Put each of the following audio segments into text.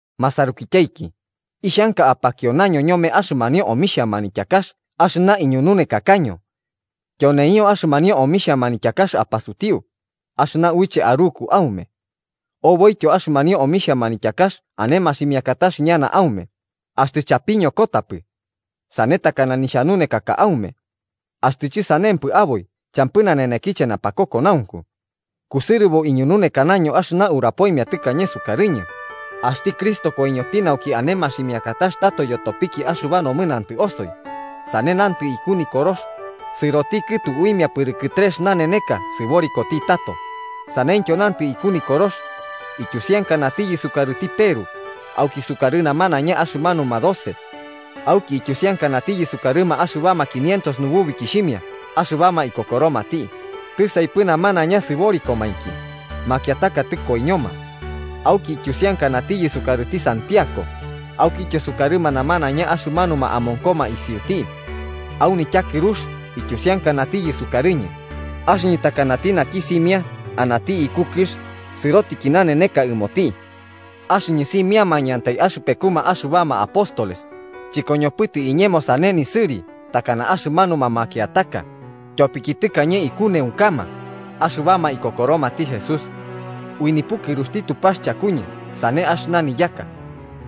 Masarukityaiki, ixhanka apakionaño ñome axɨmanio omixhia manityakax axɨna iñununekakaño. Tyoneio axɨmanio omixhia manityakax apasutiu, axɨna uiche aruku aume. Oboityo axɨmanio omixhia manityakax ane maximiakatax ñana aume, axtɨ chapiñokotapɨ. Sane takana nixhanunekaka aume. Axtɨ chɨsanempɨ aboi champɨ nanenekiche napakokonaunku. Kusɨrɨbo iñununekanaño axɨna urapoimia tɨkañe sukarɨñɨ, axti Cristo koiñoti nauki ane maximiakatax tato yotopiki axɨba nomɨnantɨ osoi, sane nantɨ iku Nikorox, sɨroti kɨtu uimia pɨrɨkɨ trex naneneka sɨborikoti tato, saneityo nantɨ iku Nikorox. Ityusiankanatiyɨ sukarɨti Peru, auki sukarɨ namanaiña axɨmanuma doce. Auki ityusiankanatiyɨ sukarɨma axɨbama quinientos nububikixhimia axɨbama ikokoromati, tisaipɨ namanaiña sɨborikomainki, makiataka tɨkoiñoma. Auki ityusiankanatiyɨ sukarɨti Santiago, aukityo sukarɨma namanaiña axɨmanuma amonkoma isiuti. Au nityakɨrux ityusiankanatiyɨ sukarɨñɨ, axɨñɨ takanati naki simia anati iku kɨx sɨrotiki naneneka ɨmoti. Axɨñɨ simiamañɨantai axɨpekuma axɨbama apóstoles, chɨkoñopɨtɨ iñemo sane nisɨri takana axɨmanuma makiataka, tyopiki tɨkañe ikuneunkama axɨbama ikokoromati Jesús. Ui nipukɨruxti Tupax chakuñɨ sane axɨna niyaka.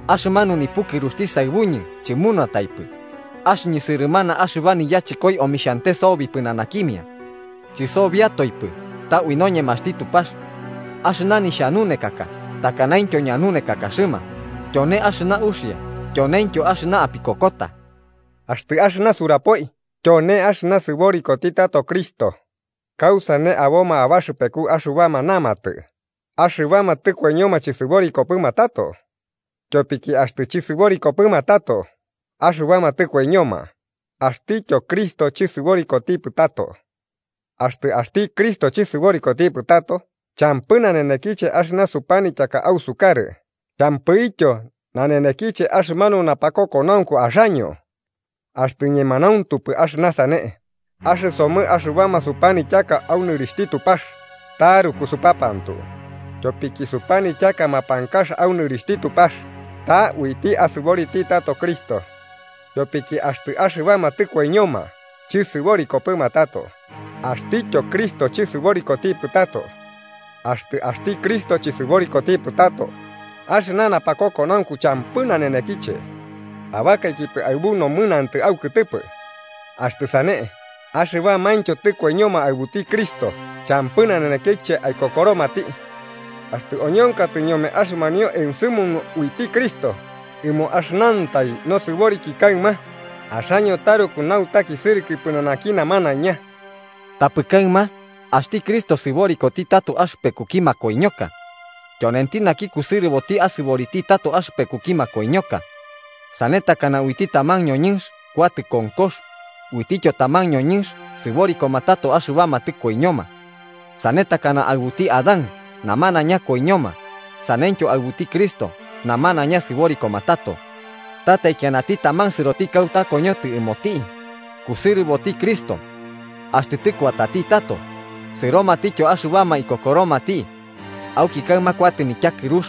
Axɨmanu nipukɨruxti saɨbuñɨ chɨmunataipɨ, axɨñɨ sɨrɨmana axɨba niyachɨkoi omixhante sobi pɨnanakimia. Chɨsobiatoipɨ ta ui noñemaxti Tupax. Axɨna nixhanunekaka takanaintyo ñanunekakaxɨma, tyone axɨna uxia tyoneintyo axɨna apikokota. Axtɨ axɨna suburapoi tyone axɨna sɨborikoti tato Cristo, ¿kausane aboma abaxɨpeku axɨbama namatɨ, axɨbama tɨkoiñoma chɨsɨborikopɨma tato? Tyopiki axtɨ chɨsɨborikopɨma tato axɨbama tɨkoiñoma, axtityo Cristo chɨsɨborikotipɨ tato. Axtɨ axti Cristo chɨsɨborikotipɨ tato, champɨ nanenekiche axɨna supanityaka ausukarɨ champɨityo nanenekiche axɨmanu napakokonaunku axaño. Axtɨ ñemanauntupɨ axɨna sane, axɨsomɨ axɨbama supanityaka au nɨrixhti Tupax taruku supapantu, tyopiki supanityaka mapankax au nɨrixhti Tupax ta uiti asɨboriti tato Cristo. Tyopiki axtɨ axɨbama tɨkoiñoma chɨsɨborikopɨma tato, axtityo Cristo chɨsɨborikotipɨ tato. Axtɨ axti Cristo chɨsɨborikotipɨ tato, axɨna napakokonaunku champɨ nanenekiche: abakaikipɨ aɨbu nomɨnantɨ aukɨtɨpɨ. Axtɨ sane, axɨbamaintyo tɨkoiñoma aɨbuti Cristo champɨ nanenekiche aikokoromati. Axtɨ oñonkatɨ ñome axɨmanio ensɨmunu uiti Cristo ɨmo axɨnantai nosɨboriki kaɨma, axoñɨ taruku nutakisɨrɨkɨ pɨnanaki namanaiña. Tapɨ kaɨma axti Cristo sɨborikoti tato axɨpekuki makoiñoka. Tyonenti naki kusɨrɨboti asɨboriti tato axɨpekuki makoiñoka. Sane takana uiti taman ñoñɨnx kuatɨ konkox, uitityo taman ñoñɨnx sɨborikoma tato axɨbama tɨkoiñoma. Sane takana aɨbuti Adán namanaiña koiñoma, saneityo aɨbuti Cristo namanaiña sɨborikoma tato. Ta taikianati taman sɨroti kauta koñotɨ ɨmoti: kusɨrɨboti Cristo. Axtɨ tɨkuatati tato, sɨromatityo axɨbama ikokoromati. Auki kaɨma kuatɨ nityakɨrux,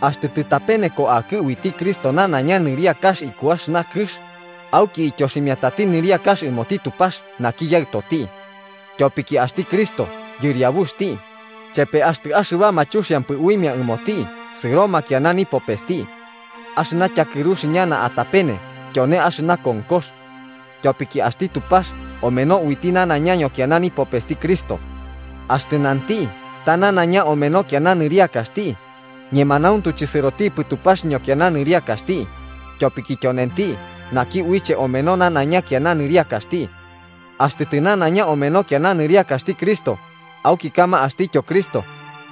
axtɨ tɨtapeneko akɨ uiti Cristo nanaiña nɨriakax iku axɨna kɨx, auki ityoximiatati nɨriakax ɨmoti Tupax naki Yaɨtoti. Tyopiki axti Cristo yɨriabuxti chepe axtɨ axɨbama chuxiampɨ uimia ɨmoti sɨroma kiana nipopesti. Axɨna tyakɨrux ñana atapene tyone axɨna konkox. Tyopiki axti Tupax omeno uiti nanaiña ñokiana nipopesti Cristo. Axtɨ nanti ta nanaiña omeno kiana nɨriakaxti, ñemanauntu chɨsɨrotipɨ Tupax ñokiana nɨriakaxti, tyopiki tyonenti naki uiche omeno nanaiña kiana nɨriakaxti. Axtɨ tɨnanaiña omeno kiana nɨriakaxti Cristo auki kaɨma axtityo Cristo,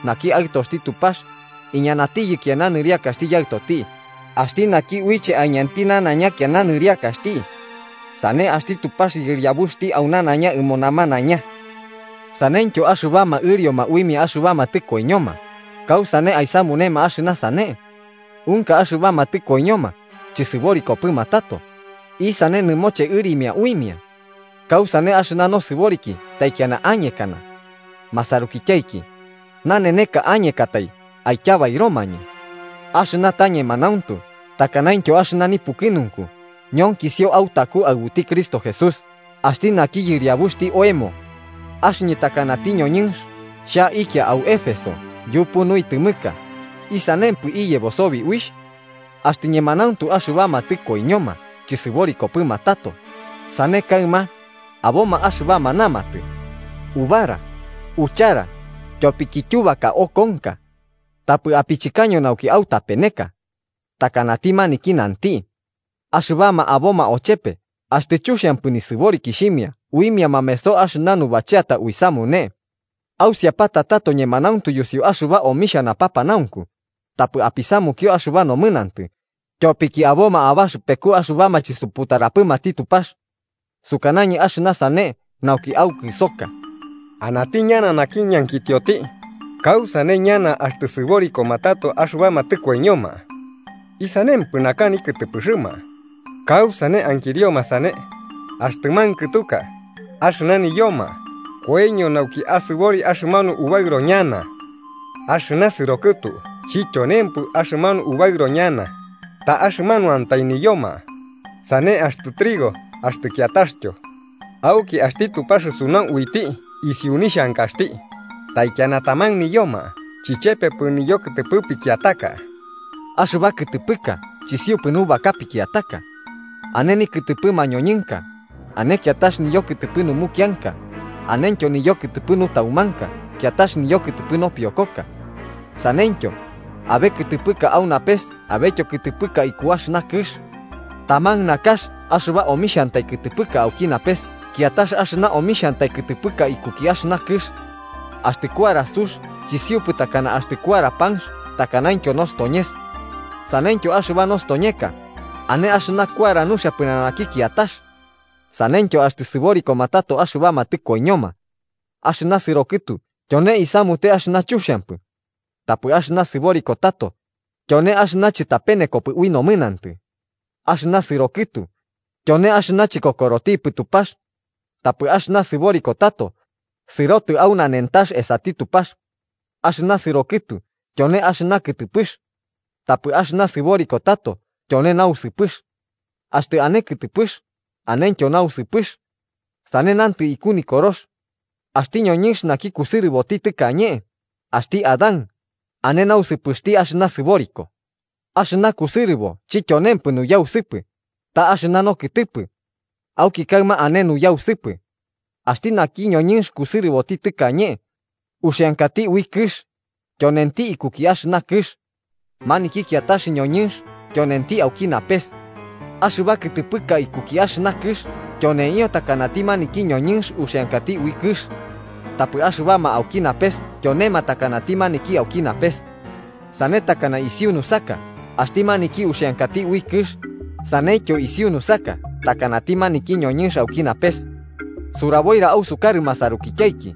naki Aɨtoxti Tupax, iñanatiyɨ kiana nɨriakaxti Yaɨtoti, axti naki uiche aiñanti nanaiña kiana nɨriakaxti. Sane axti Tupax Yɨriabuxti au nanaiña ɨmo namanaiña. Saneityo, axɨbama ɨrioma uimia axɨbama tɨkoiñoma, ¿kausane aisamunema axɨna sane? Unka axɨbama tɨkoiñoma chɨsɨborikopɨma tato, ¿isane nɨmoche ɨrimia uimia? ¿Kausane axɨna nosɨboriki taikiana añekana? Masarukityaiki, naneneka añekatai aityabairomañɨ. Axɨna ta ñemanauntu takanaintyo axɨna nipukɨnunku ñonkisio autaku aɨbuti Cristo Jesús axti naki Yɨriabuxti oemo. Axɨñɨ takanati ñoñɨnx xhaikia au Éfeso yupu nuitɨmɨka, ¿isanempɨ iyebo sobi uixh? Axtɨ ñemanauntu axɨbama tɨkoiñoma chɨsɨborikopɨma tato, sane kaɨma, aboma axɨbama namatɨ: “¡Ubara, uchara, tyopiki tyubaka okonka!” Tapɨ apichɨkaño nauki autapeneka. Takanati maniki nanti: “Axɨbama aboma ochepe axtɨ chuxiampɨ nisɨborikixhimia uimia mameso axɨna nubacheata uisamune.” Ausiapata tato ñemanauntu yusiu axɨba omixhia napapanaunku, tapɨ apisamukio axɨba nomɨnantɨ, tyopiki aboma abaxɨpeku axɨbama chisuputarapɨmati Tupax. Sukanañɨ axɨna sane nauki aukɨsoka. Anati ñana naki ñankitioti: “¿Kausane ñana axtɨ sɨborikoma tato axɨbama tɨkoiñoma? ¿Isanempɨ naka nikɨtɨpɨxɨma?” ¿Kausane ankirioma sane? Axtɨ mankɨtuka, axɨna niyoma koiño nauki asɨbori axɨmanu ubaɨro ñana. Axɨna sɨro kɨtu chityonempɨ axɨmanu ubaɨrobo ñana, ta axɨmanuantai niyoma, sane axtɨ trigo axtɨ kiataxtyo. Auki axti Tupax sunau uiti isiu nixhankaxti, taikiana taman niyoma chichepepɨ niyokɨtɨpɨ pikiataka. Axɨba kɨtɨpɨka chisiupɨ nubaka pikiataka. Ane nikɨtɨpɨ mañoñɨnka, ane kiatax niyokɨtɨpɨ numukianka, anentyo niyokɨtɨpɨ nutaumanka kiatax niyokɨtɨpɨ nopiokoka. Saneityo, abe kɨtɨpɨka au napes abetyo kɨtɨpɨka iku axɨna kɨx. Taman nakax axɨba omixhantai kɨtɨpɨka auki napes kiatax axɨna omixhantai kɨtɨpɨka ikuki axɨna kɨx. Axtɨ kuara sux chisiupɨ takana axtɨ kuara panx takanaintyo nostoñeka. Saneityo axɨba nostoñeka, ane axɨna kuara nuxia pɨnanaki kiatax. Saneityo axtɨ sɨborikoma tato axɨbama tɨkoiñoma. Axɨna sɨro kɨtu tyone isamute axɨna chuxiampɨ. Tapɨ axɨna sɨboriko tato tyone axɨna chɨtapenekopɨ ui nomɨnantɨ. Axɨna sɨro kɨtu tyone axɨna chikokorotipɨ Tupax. Tapɨ axɨna sɨboriko tato sɨrotɨ au nanentax esati Tupax. Axɨna sɨrokɨtu tyone axɨna kɨtɨpɨx. Tapɨ axɨna sɨboriko tato tyone nausɨpɨx. Axtɨ ane kɨtɨpɨx, anentyo nausɨpɨx. Sane nantɨ iku Nikorox: “Axti ñoñɨnx naki kusɨrɨboti tɨkañe, axti Adán, ane nausɨpɨxti axɨna sɨboriko.” Axɨna kusɨrɨbo chityonempɨ nuyausɨpɨ, ta axɨna nokɨtɨpɨ. Auki kaɨma ane nuyausɨpɨ. Axti naki ñoñɨnx kusɨrɨboti tɨkañe, uxiankati ui kɨx, tyonenti ikuki axɨna kɨx. Maniki kiatax ñoñɨnx tyonenti auki napes. Axɨba kɨtɨpɨka ikuki axɨna kɨx tyoneio takanati maniki ñoñɨnx uxiankati ui kɨx. Tapɨ axɨbama auki napes tyonema takanati maniki auki napes. Sane takana isiu nusaka axti maniki uxiankati ui kɨx, saneityo isiu nusaka takanati maniki ñoñɨnx auki napes. Suraboira ausukarɨ masarukityaiki,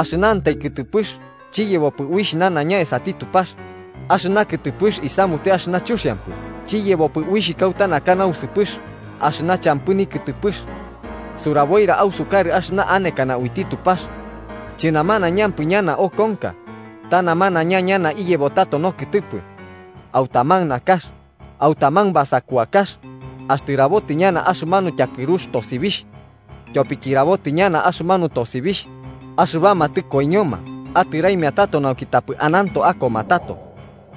axɨnantai kɨtɨpɨx chiyebopɨ uixh ñana esati Tupax, axɨna kɨtɨpɨx isamute axɨna chuxiampɨ chiyebopɨ uixh kauta naka nausɨpɨx axɨna champɨ nikɨtɨpɨx. Suraboira ausukarɨ axɨna anekana uiti Tupax: chɨnamanaiñampɨ ñana okonka, ta namanaiña ñana iyebo tato nokɨtɨpɨ. Au taman nakax, au taman basakuakax, axtɨ rabotɨ ñana axɨmanu tyakɨrux tosibixh. Tyopiki rabotɨ ñana axɨmanu tosibixh, axɨbama tɨkoiñoma atɨraimia tato nauki tapɨ ananto akoma tato.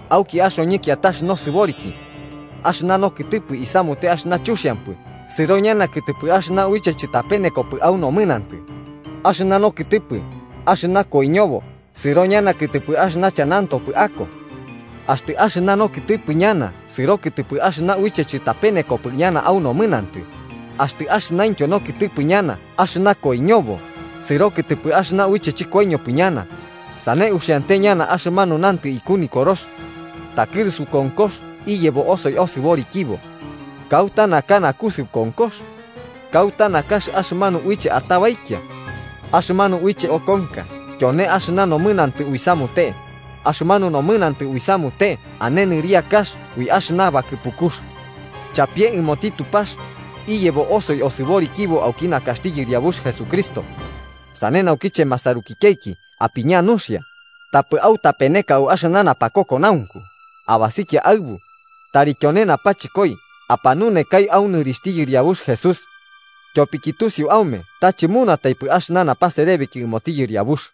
Auki axoñɨ kiatax nosɨboriki. Axɨna nokɨtɨpɨ isamute axɨna chuxiampɨ sɨro ñana kɨtɨpɨ axɨna uiche chɨtapenekopɨ au nomɨnantɨ, axɨna nokɨtɨpɨ axɨna koiñobo sɨro ñana kɨtɨpɨ axɨna chanantopɨ ako. Axtɨ axɨna nokɨtɨpɨ ñana sɨro kɨtɨpɨ axɨna uiche chɨtapenekopɨ ñana au nomɨnantɨ, axtɨ axɨnaintyo nokɨtɨpɨ ñana axɨna koiñobo sɨro kɨtɨpɨ axɨna uiche chɨkoiñopɨ ñana, sane uxiante ñana axɨmanu nantɨ iku Nikorox: “Takɨrusu konkox iyebo osoi osɨborikibo. ¿Kauta naka nakusɨu konkox? ¿Kauta nakax axɨmanu uiche atabaikia?” Axɨmanu uiche okonka tyone axɨna nomɨnantɨ uisamute, axɨmanu nomɨnantɨ uisamute ane nɨriakax ui axɨna bakɨpukux. ¡Chapie ɨmoti Tupax, iyebo osoi osɨborikibo auki nakaxti Yɨriabux Jesucristo! Sane naukiche, masarukityaiki apiña nuxia, tapɨ autapeneka au axɨna napakokonaunku abasikia aɨbu, tari tyone napachɨkoi apanunekai au nɨrixhti Yɨriabux Jesús. Tyopiki tusiu aume ta chɨmunataipɨ axɨna napaserebiki ɨmoti Yɨriabux.